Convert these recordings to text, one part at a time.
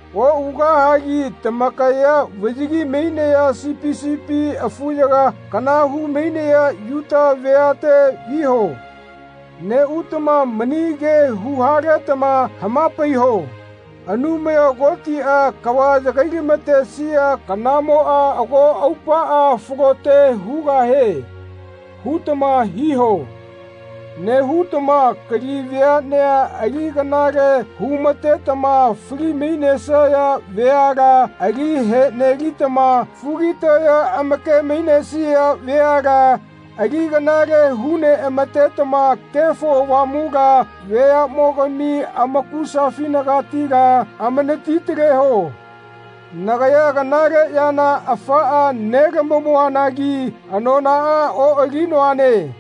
Oꞌugahagi tamakaya vaꞌyagi mainaya sipi sipi afuyaga kana hu-mainaya Yuta veate viho. Neꞌutama mani ke hu-haletama hama-paiho “Anumaya Kotiꞌa kava yagai-lama-tesia kanamoꞌa ago aupaꞌa falote hugahie.” hutama hiho. Nehutama kali veaꞌnea ali kanale hu-matetama fali-mainesaya veala ali heꞌnelitama fugitaya amake-mainesia veala ali kanale hu-neꞌama-tetama Kefo Avamula veaꞌmogami amakusafinagatila amanati-taleho. Nagaya kanale yana afaꞌa nelamamuanagi anonaꞌa oꞌalinoane.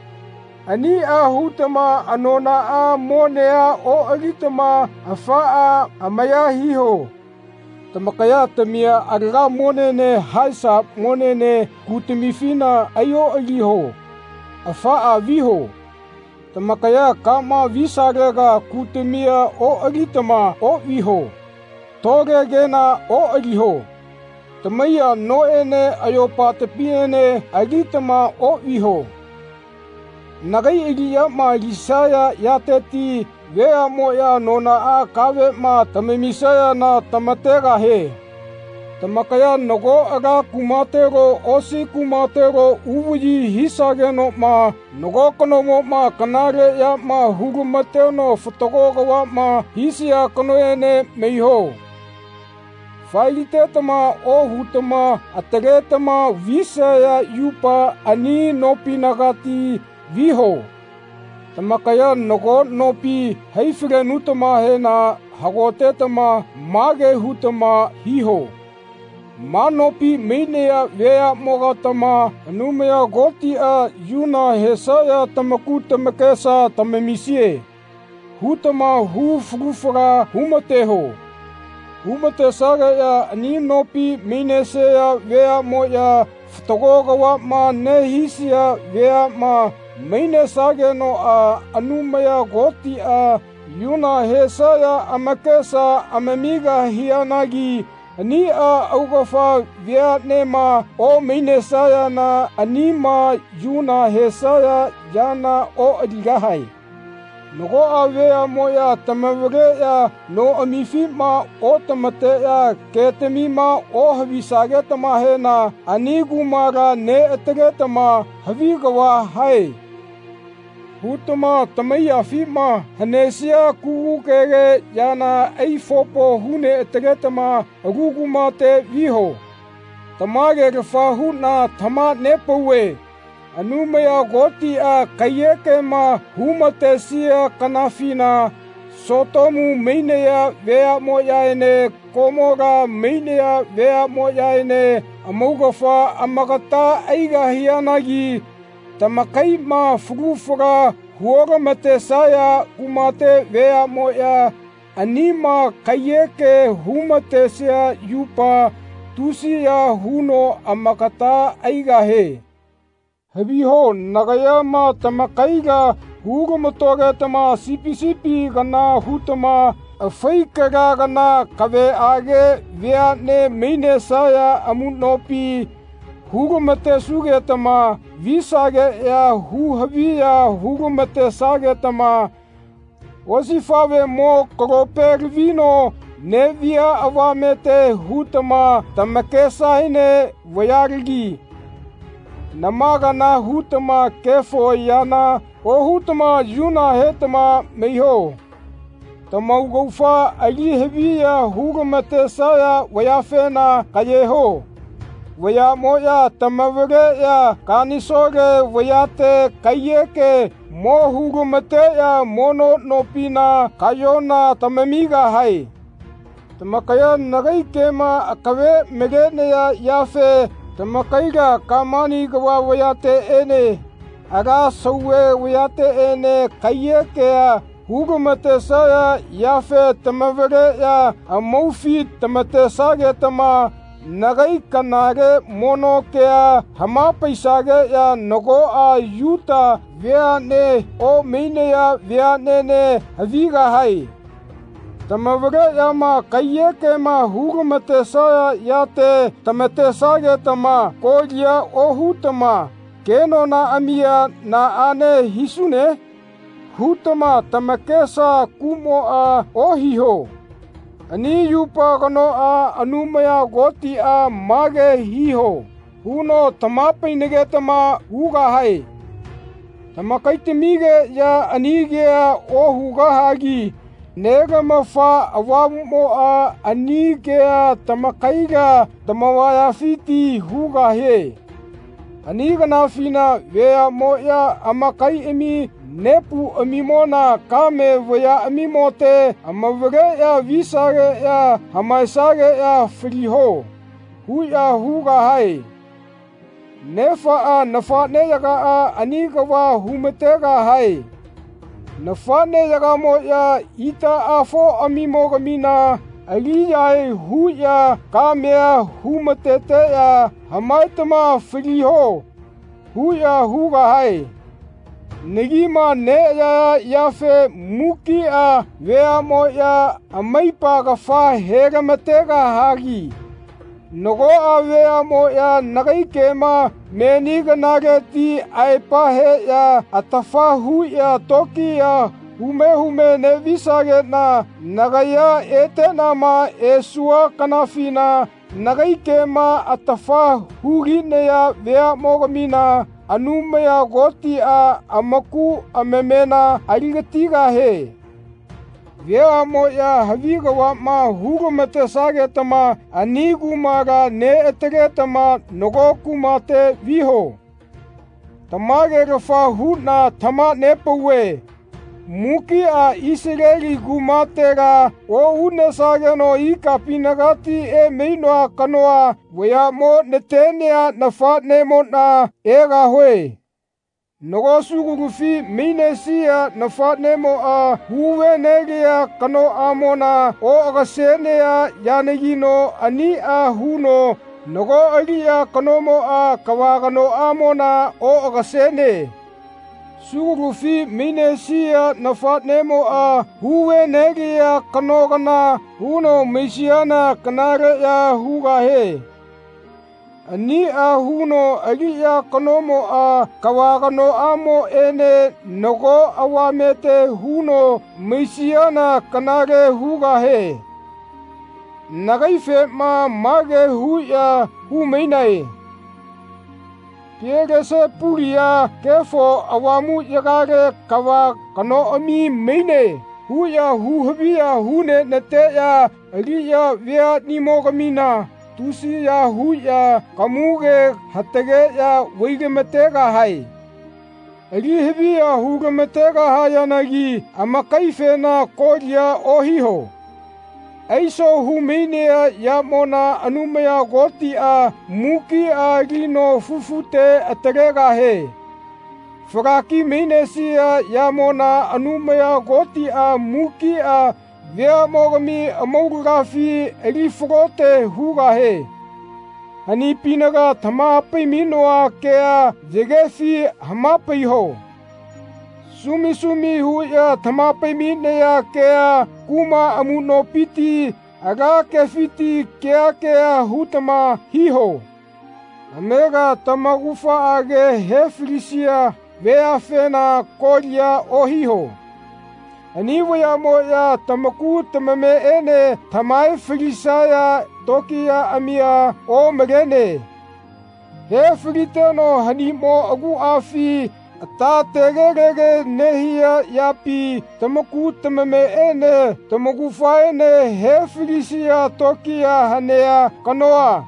Aniꞌa hutama anonaꞌa monea oꞌalitama afaꞌa amaya hiho. Tamakaya tamia alaga monene haesa monene kutamifina ai-oꞌaliho afaꞌa viho. Tamakaya kama visalega kutamia oꞌalitama oꞌviho. Tole kena oꞌaliho. Tamaiya noꞌene ayopatamiene alitama oꞌviho. Nagai aliꞌyama alisaya yateti veaꞌmoꞌya anonaꞌa kaveꞌma tamamisayana tama-tegahie. Tamakaya nago ala kumatelo osi kumatelo uvaꞌyi hisagenoꞌma nago kanomoꞌma kanale yama hu-lama-teno fatago kavaꞌma hisia kanoene maiho. Fae-litetama ohutama ataletama visaya yupa ani nopinagati viho. Tamakaya nago nopima hai-falenutamahena hagotetama mage hutama hiho “Ma nopi mainaya veaꞌmogatama Anumaya Kotiꞌa yuna hesaya tamaku tamakesa tamamisie.” hutama hu falu fala hu-mateho. Hu-matesageꞌya ani nopi mainesaya veaꞌmoꞌya fatago kavaꞌma nehisaya veaꞌma mainesagenoꞌa Anumaya Kotiꞌa yuna hesaya amakesa amamigahianagi aniꞌa augafa veaꞌnema omainesayana anima yuna hesaya yana oꞌaligahae. Nagoꞌa veaꞌmoꞌya tamavaleꞌya noꞌamifima otama-teꞌya ketamima ohavisagetamahena ani kumala neꞌataletama “Havi kava hae.” hutama tamaiyafima hanesia kugukege yana ai-fopo hu-neꞌataletama alu kumate viho. Tamage-lafa huꞌna tamaha-nepauve Anumaya Kotiꞌa kaiyekema hu-matesia kanafina Sotomu mainaya veaꞌmoyaene Komola mainaya veaꞌmoyaene amaugafa amagata aigahianagi tamakaiꞌma falu fala hu-otama-tesaya kumate veaꞌmoꞌya anima kaiyeke hu-ma-tesia yupa tusiya huno amagata aigahie. Haviho nagaya tamakaila hu-lama-togetama sipi sipi kana hutama afai kala kana kaveꞌage veaꞌne mainesaya amuꞌnopi hu-lama-tesugetama visageꞌya hu-haviya hu-lama-tesagetama osifaꞌvemo kalope lavino neꞌvia avamete hutama tamakesaene vayalagi nama kana hutama kefo yana ohutama yuna hetama maiho. Tamaugafa ali haviya hu-lama-tesaya vayafena kaꞌyeho. Vayaꞌmoꞌya tamavaleꞌya kanisole vayate kaiyeke mo hu-lama-teꞌya mono nopina kaꞌyona tamamigahae. Tamakaya nagai kema akave malenaya yafe tamakaila Kamani kava vayateꞌene ala Sauve vayateꞌene kaiyekea hu-lama-tesaya yafe tamavaleꞌya amaufi tama-tesagetama nagai kanale mono kea hama-paisageꞌya nagoꞌa Yuta veaꞌne omainaya veaꞌnene havigahae. Tama-valeꞌyama kaiyekema hu-lama-tesaya yate tama-tesagetama kolia ohutama “Kenonaꞌamia naꞌane hisune?” hutama tamakesa kuꞌmoꞌa ohiho. Ani yupa kanoꞌa Anumaya Kotiꞌa “Mage hiho.” huno tamaha-painagetama hugahae. Tamakaitamigeꞌya ani kea ohugahagi Nelamafa Avamuꞌmoꞌa ani kea tamakaila tamavayafiti hugahie. Ani kanafina veaꞌmoꞌya amakaiꞌami nepuꞌamimona kame vayaꞌamimote amavaleꞌya visageꞌya “Hamaegeꞌya faliho.” huꞌya hugahae. Nefaꞌa nafaꞌneyagaꞌa ani kava hu-ma-tegahae. Nafaꞌneyagamoꞌya itaꞌafoꞌamimogamina ali-yahae huꞌya kamea hu-ma-teteꞌya “Hamaetama faliho.” huꞌya hugahae. Nagima neꞌayaya yafe mukiꞌa veaꞌmoꞌya amaipa kafa he-lama-tegahagi nagoꞌa veaꞌmoꞌya nagai kema meni kanaleti aepa heꞌya atafa huꞌya tokiya hume hume neꞌvisageꞌna nagaya eteꞌnama esua kanafina nagai kema atafa hu-linaya veaꞌmogamina Anumaya Kotiꞌa amaku amamena ali-gatigahie. Veaꞌmoꞌya havi kavaꞌma hu-lama-tesagetama ani kumala neꞌataletama nago kumate viho. Tamage-lafa huꞌna tamaha-nepauve mukiꞌa Isaleli kumatela oꞌunesageno ikapinagati emainoa kanoa vayaꞌmo natenea nafaꞌnemoꞌna egahue. Nago sugulufi mainesia nafaꞌnemoꞌa hu-ve-nelia kanoꞌamona oꞌagasenea yanagino aniꞌa huno nago aliꞌya kanomoꞌa kava kanoꞌamona oꞌagasene. Sugulufi mainesia nafaꞌnemoꞌa hu-ve-nelia kano kana huno maisiana kanaleꞌya hugahie. Aniꞌa huno aliꞌya kanomoꞌa kava kanoꞌamoꞌene nago avamete huno maisiana kanale hugahie. Nagaifena mage huꞌya hu-mainae “Pielesepulia Kefo Avamuꞌyagale kava kanoꞌami maine.” huꞌya hu-haviya hu-nenateꞌya aliꞌya veaꞌnimogamina tusiya huꞌya kamuge hatageꞌya vai-lama-tegahae. Ali haviya hu-lama-tegahayanagi amakaifena kolia ohiho. Aiso hu-mainea yamona Anumaya Kotiꞌa mukiꞌa alino fufute atalegahie. Falaki-mainesia yamona Anumaya Kotiꞌa mukiꞌa veaꞌmogami amaulagafi ali-falote hugahie. Hanipinaga tamaha-pai-mainoa kea yagefi hama-paiho. Sumi sumi huꞌya tamaha-pai-mainaya kea kuma amuꞌnopiti ala kefiti keha keha hutama hiho. Amega tamaugafaꞌage he-falisaya veafena kolia ohiho. Ani vayaꞌmoꞌya tamaku tamameꞌenema tamahae falisaya tokiyaꞌamia omalene. He-faliteno hanimo aguꞌafi ata tege-lege nehia yapi tamaku tamameꞌene tamaugafaene he-falisia tokiya hanea kanoa,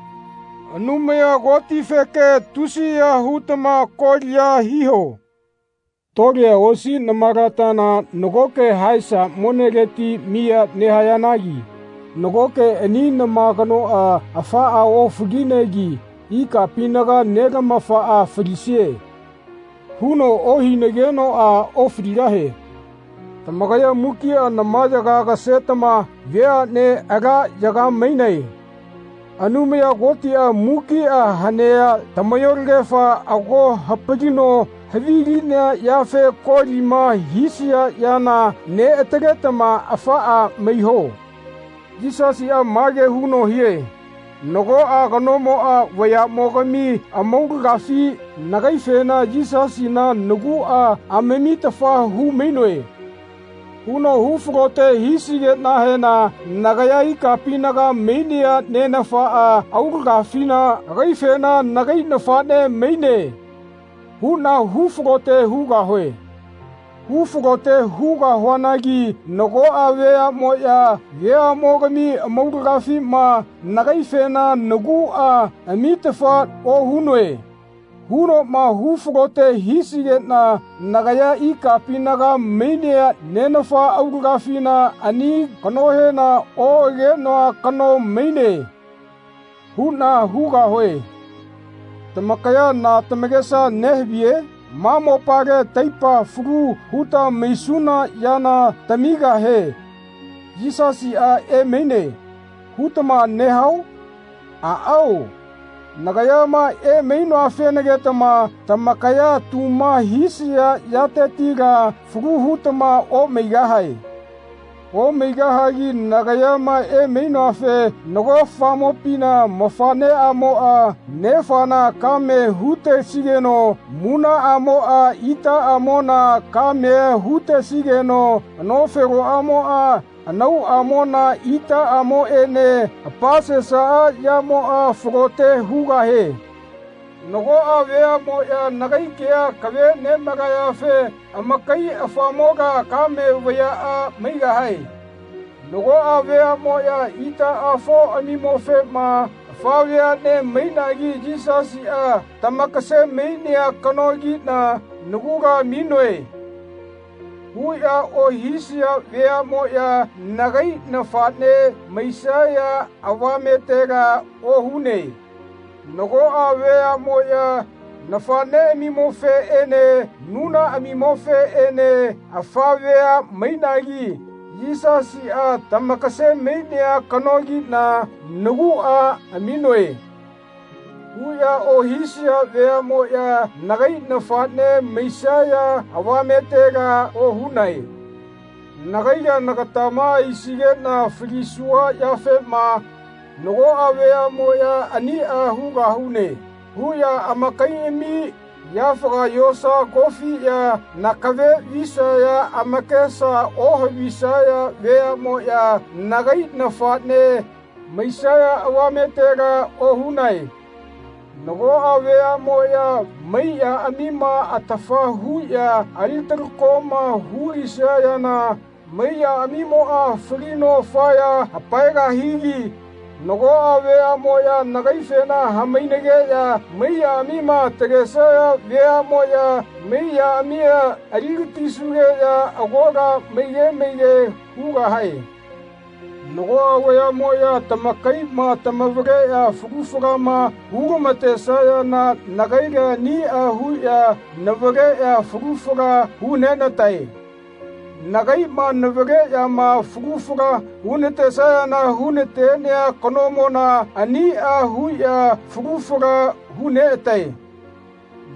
Anumaya Kotifeke, tusiya hutama kolia hiho. Tolea osi namalatana nagoke haesa moneleti miya nehayanagi nagoke ani nama kanoꞌa afaꞌa ofalinegi ikapinaga Nelamafaꞌa “Falisie.” huno ohinagenoꞌa ofaligahie. Tamakaya mukiꞌa namayaga agasetama veaꞌnea ala yaga mainae. Anumaya Kotiꞌa mukiꞌa hanea tamayolagefa ago hapalino havilinea yafe kolima hisaya yana neꞌataletama afaꞌa maiho. Yisasiꞌa mage huno hie “Nagoꞌa kanomoꞌa veaꞌmogami amaulagafi nagaifema ‘Yisasina naguꞌa amitafa hu-mainoe.’ huno hu-falote hisigeꞌnahena nagaya ikapinaga mainea Nenafa aulagafina agaifena ‘Nagai nafaꞌne maine.’ huꞌna hu-falote hugahue. Hu-falote hugahuanagi nagoꞌa veaꞌmoꞌya veaꞌmogami amaulagafima nagaifena ‘Naguꞌa amitafa ohunoe.’ hunoꞌma hu-falote hisigeꞌna nagaya ikapinaga mainea Nenafa aulagafina ani kanohena ‘Oꞌagenoa kano maine.’ huꞌna hugahue.” Tamakaya na tamakesa nehaviye? “Ma mopale taipa falu huta maisuna yana tamigahe Yisasiꞌa emaine.” hutama nehao? Aꞌao nagayama emainoafenagitama tamakaya tuma hisaya yatetila falu hutama omaigahae. Omaigahagi nagaya emainoafe nago afamopina nafaꞌneꞌamoꞌa nefana kame hu-tesigeno munaꞌamoꞌa itaꞌamona kamea hu-tesigeno anofeloꞌamoꞌa anauꞌamona itaꞌamoꞌene apasesaꞌa yamoꞌa falote hugahie. Nagoꞌa veaꞌmoꞌya nagai kea akave nemalayafe amakai afamola kame vayaꞌa maigahae. Nagoꞌa veaꞌmoꞌya itaꞌafoꞌamimofema “Afa veaꞌne mainagi Yisasiꞌa tamakase-mainea kanogiꞌna nagula aminoe.” huꞌya ohisaya veaꞌmoꞌya nagai nafaꞌne maisaya avametela ohune. Nagoꞌa veaꞌmoꞌya nafaꞌneꞌamimofeꞌene munaꞌamimofeꞌene “Afa vea mainagi Yisasiꞌa tamakase-mainea kanogiꞌna naguꞌa aminoe.” huꞌya ohisaya veaꞌmoꞌya nagai nafaꞌne maisaya avametela ohunae. Nagaila nagatama aisigeꞌna falisua yafema nagoꞌa veaꞌmoꞌya “Aniꞌa hugahune.” huꞌya amakaiꞌami yafaga yosa kofiꞌya nakave visaya amakesa ohavisaya veaꞌmoꞌya nagai nafaꞌne maisaya avametela ohunae. Nagoꞌa veaꞌmoꞌya maiyaꞌamima atafa huꞌya ali-talakoma hu-lisayana maiyaꞌamimoꞌa falino afaya hapaegahigi nagoꞌa veaꞌmoꞌyama nagaifema hamainageꞌya maiyaꞌamima atalesaya veaꞌmoꞌya maiyaꞌamia ali-gatisugeꞌya agola maige maige hugahae. Nagoꞌa veaꞌmoꞌya tamakaiꞌma tamavaleꞌya falu falama hu-lama-tesayana nagaila aniꞌa huꞌya navaleꞌya falu fala hu-nenatae. Nagaiꞌma navaleꞌyama falu fala hu-natesayana hu-na-tenea kanomona aniꞌa huꞌya falu fala hu-neꞌatae.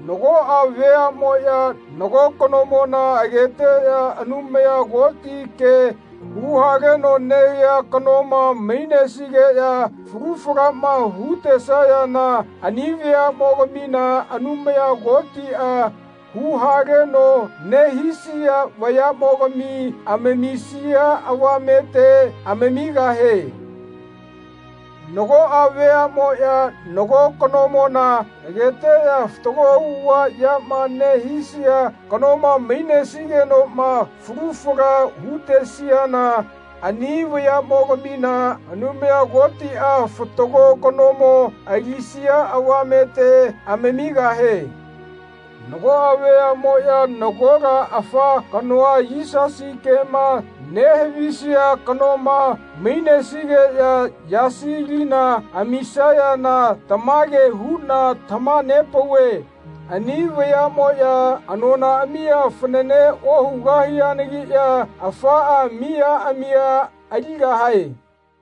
Nagoꞌa veaꞌmoꞌya nago kanomona ageteꞌya Anumaya Koti ke hu-haleno nehia kanoma mainesigeꞌya falu falama hu-tesayana ani veaꞌmogamina Anumaya Kotiꞌa hu-haleno nehisia vayaꞌmogami amamisia avamete amamigahie. Nagoꞌa veaꞌmoꞌya nago kanomona ageteꞌya fatago auꞌava yama nehisia kanoma mainesigenoꞌma falu fala hu-tesiana ani veaꞌmogamina Anumaya Kotiꞌa fatago kanomo alisia avamete amamigahie. Nagoꞌa veaꞌmoꞌya nagola afa kanoa Yisasi kema nehavisia kanoma mainesigeꞌya yasi lima amisayana tamage huꞌna tamaha-nepauve ani veaꞌmoꞌya anonaꞌamia fanane ohugahianagiꞌya afaꞌa miyaꞌamia aligahae.